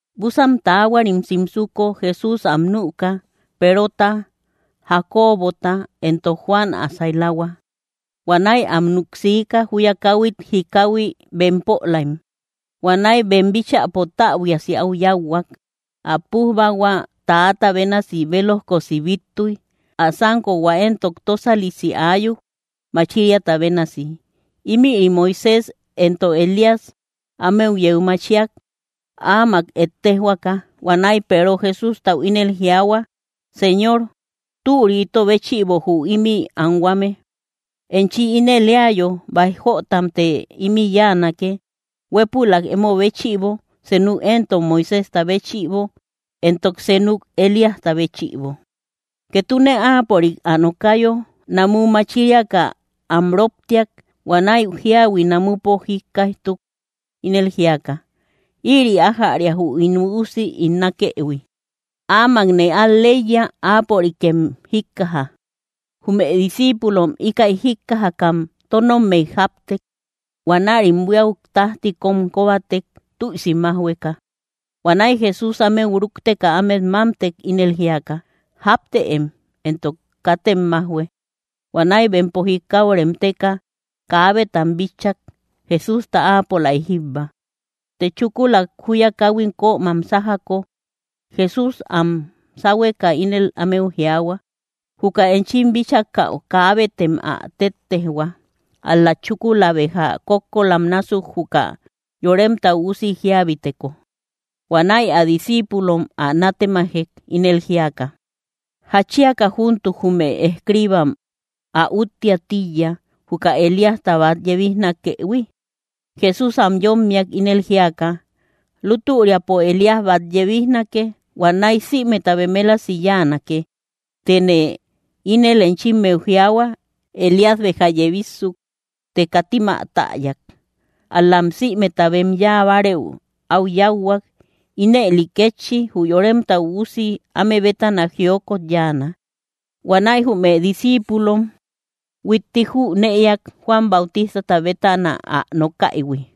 Búsan taahuarim simsuko, Jesús am nüka, Perota, Jacobota, entok Juan ä sailahua. Huanäi am nuk siika, júya káhuit jikahui bempolaim. Huanäi bem bíchäpo täbuiasi áu yáuhuak. Ä pújbahua täata bénasi bélojkosi bíttuy; ä sánkohua éntok tósalisi aayuk, machiriata bénasi. Ímïri Moisés entok Elías ámeu yeu machiak, áamak ettejhuaka. Huanäi Peero Jesústau ínel jiaahua: —Señor, ¡türi ito béchïbo jü ímï anhuame! Enchi ínel éayo, báij jötamte ímï yáanake: huépülak emo béchïbo, senuk entok Moiséjta béchïbo, entok senuk Elíasta béchïbo. Ketune áapörik ä nokayo, namu machiriaka am róptiak. Huanäi jíahui namupo jíkkaijtuk, ínel jíaka: —Ïri ájäria jü ín Üusi ín nákëhui. Áamakne al‑leiya; áapörikem jíkkaja. Jume discíipulom íkäi jíkkajakam tónommey jáptek. Huanärim buíau tájti kom kóbatek, tüisi májhueka. Huanäi Jesús ámeu rúkteka ámet mámtek, ínel jíaka: —Jáptëem; entok katem májhue. Huanäi bempo jikau remteka, kaabetam bitchak, Jesústa áapolaik jíbba. Të chúkula júya káhuit kömam sájako, Jesús ám sáhueka ínel ámeu jiaahua: —Juka enchim bíchakäu, kaabetem ä téttejhua, ál‑la chúkula béja kókkolam násuk juka Yoremta Üusi jíabiteko. Huanäi ä discíipulom ä nátemajek, ínel jíaka: —¿Jatchiaka júntuk jume escriibam ä úttiä tíiya, jüka Elíasta bát yebijnakëhui? Jesús am yómmiak, ínel jíaka: —Lútüriapo, Elías bát yebijnake; huanäi sïmeta bemelasi yánake. Tëne ínel enchimmeu jiaahua, Elías béja yebissuk, të katim ä täyak, ál‑lam sïmeta bem yáa bárëu áu yáuhuak. Ínëli kétchi jü Yoremta Üusi áme bétana jiokot yáana. Huanäi jume discíipulom huitti jünëiak, Juan Bautistata bétana ä nokaïhui.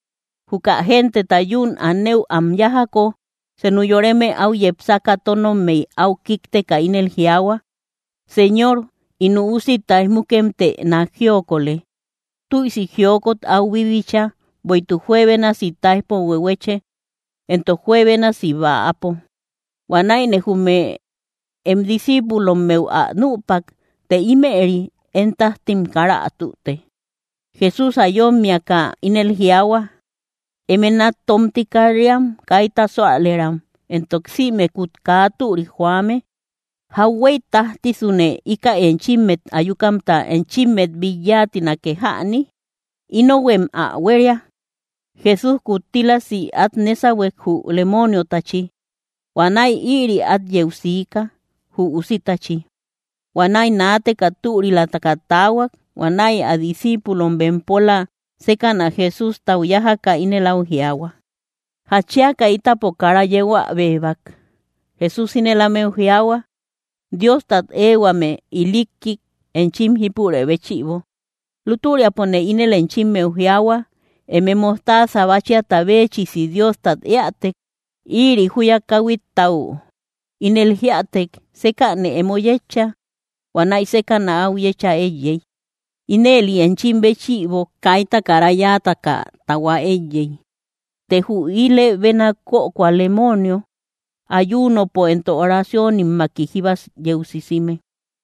Juka genteta yún anëu am yájako, senu yoreme áu yepsaka tónommey áu kíkteka ínel jiaahua: —Señor, ín üusi táij múmukemtë nák jiokolë, tüisi jiokot áu bíbicha; bueïtuk juebénasi táijpo huehueche, entok juebénasi bäapo. Huanäine jume em discíipulommeu ä nüpak, të ímëri én tájtim kara ä tüte. Jesús ä yómmiaka ínel jiaahua: —¡Eme nat tómti kat‑riam kaita súalëram, entok sïmekut kaa türik joame! ¿Jauhuey tájtisune ikäi enchimmet ayukamta enchimmet bit yáatinake jäni? Inohuem ä huéria. Jesús kuttílasi át nésahuek, jü lemooniotachi. Huanäi ïri át yeu siika, jü usitachi. Huanäi naateka türilataka taahuak. Huanäi ä discíipulom bempola sékäna Jesústau yájaka, ínel áu jiaahua: —¿Jatchiaka ítapo kara yeu ä béebak? Jesús ínel ámeu jiaahua: —Diostat éehuame ilikkik enchim jípure béchïbo. Lútüriapone ínel enchimmeu jiaahua, eme mojtaasa báchiata béechisi Diostat éätek, ïri júya káhuittau ínel jíätek: “Sékänë emo yetcha”, huanäi sékäna áu yécha éiyey. Ínëli enchim béchïbo kaita kara yáataka tahua éiyey. Të jü ilë béna kökoa lemoonio, ayuunopo entok oraciónimmaki jíba yeu sisime.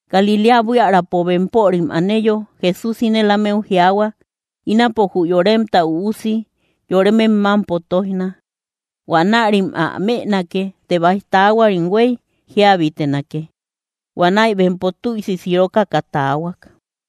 Galiléa buiärapo bempörim aneyo, Jesús ínel ámeu jiaahua: —Ínapo jü Yoremta Üusi yóremem mámpo tóijna. Huanärim ä mënake; të báij taahuarim huéy jíabitenake. Huanäi bempo tüisi sirokoka taahuak.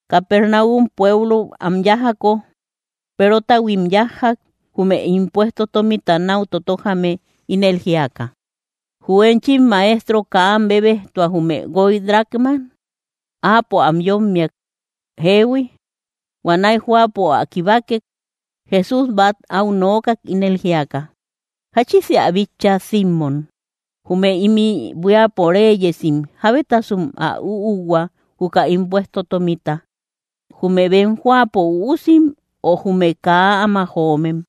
Capernaum pueblou am yájako, Perotahuim yájjak, jume impuesto tómita náu totojame, ínel jíaka: —¿Jü enchim Maestro kaa am bébejtua, jume guoy dracmam? Áapo am yómmiak: —Jeehui. Huanäi jóapo ä kibakek, Jesús bát au nookak, ínel jíaka: —¿Jáchisë ä bitcha, Simmom? Jume ímï buíapo réyesim, ¿jábetasum ä úuhua, juka impuesto tómita: jume bem jóapo uusim, ö jume kaa áma joomem?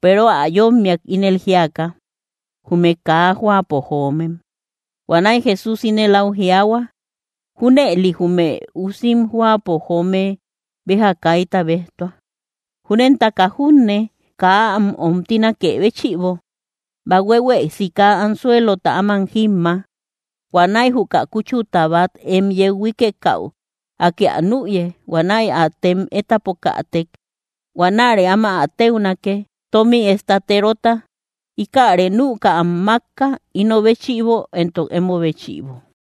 Peero ä yómmiak, ínel jíaka: —Jume kaa jóapo joomem. Huanäi Jesús ínel áu jiaahua: —Júnëli jume usim jóapo joome béja kaita béjtua. Júnentaka junne, kaa am omtinakë béchïbo, bahuehuë sika anzuelota áman jímma. Huanäi juka kúchuta bát em yeu huíkekäu, Akë ä nüye huanäi ä tem étapokätek. Huanäre áma ä téunake, tómi estaterota. Íkäre nüka am mákka, íno béchïbo entok émo béchïbo.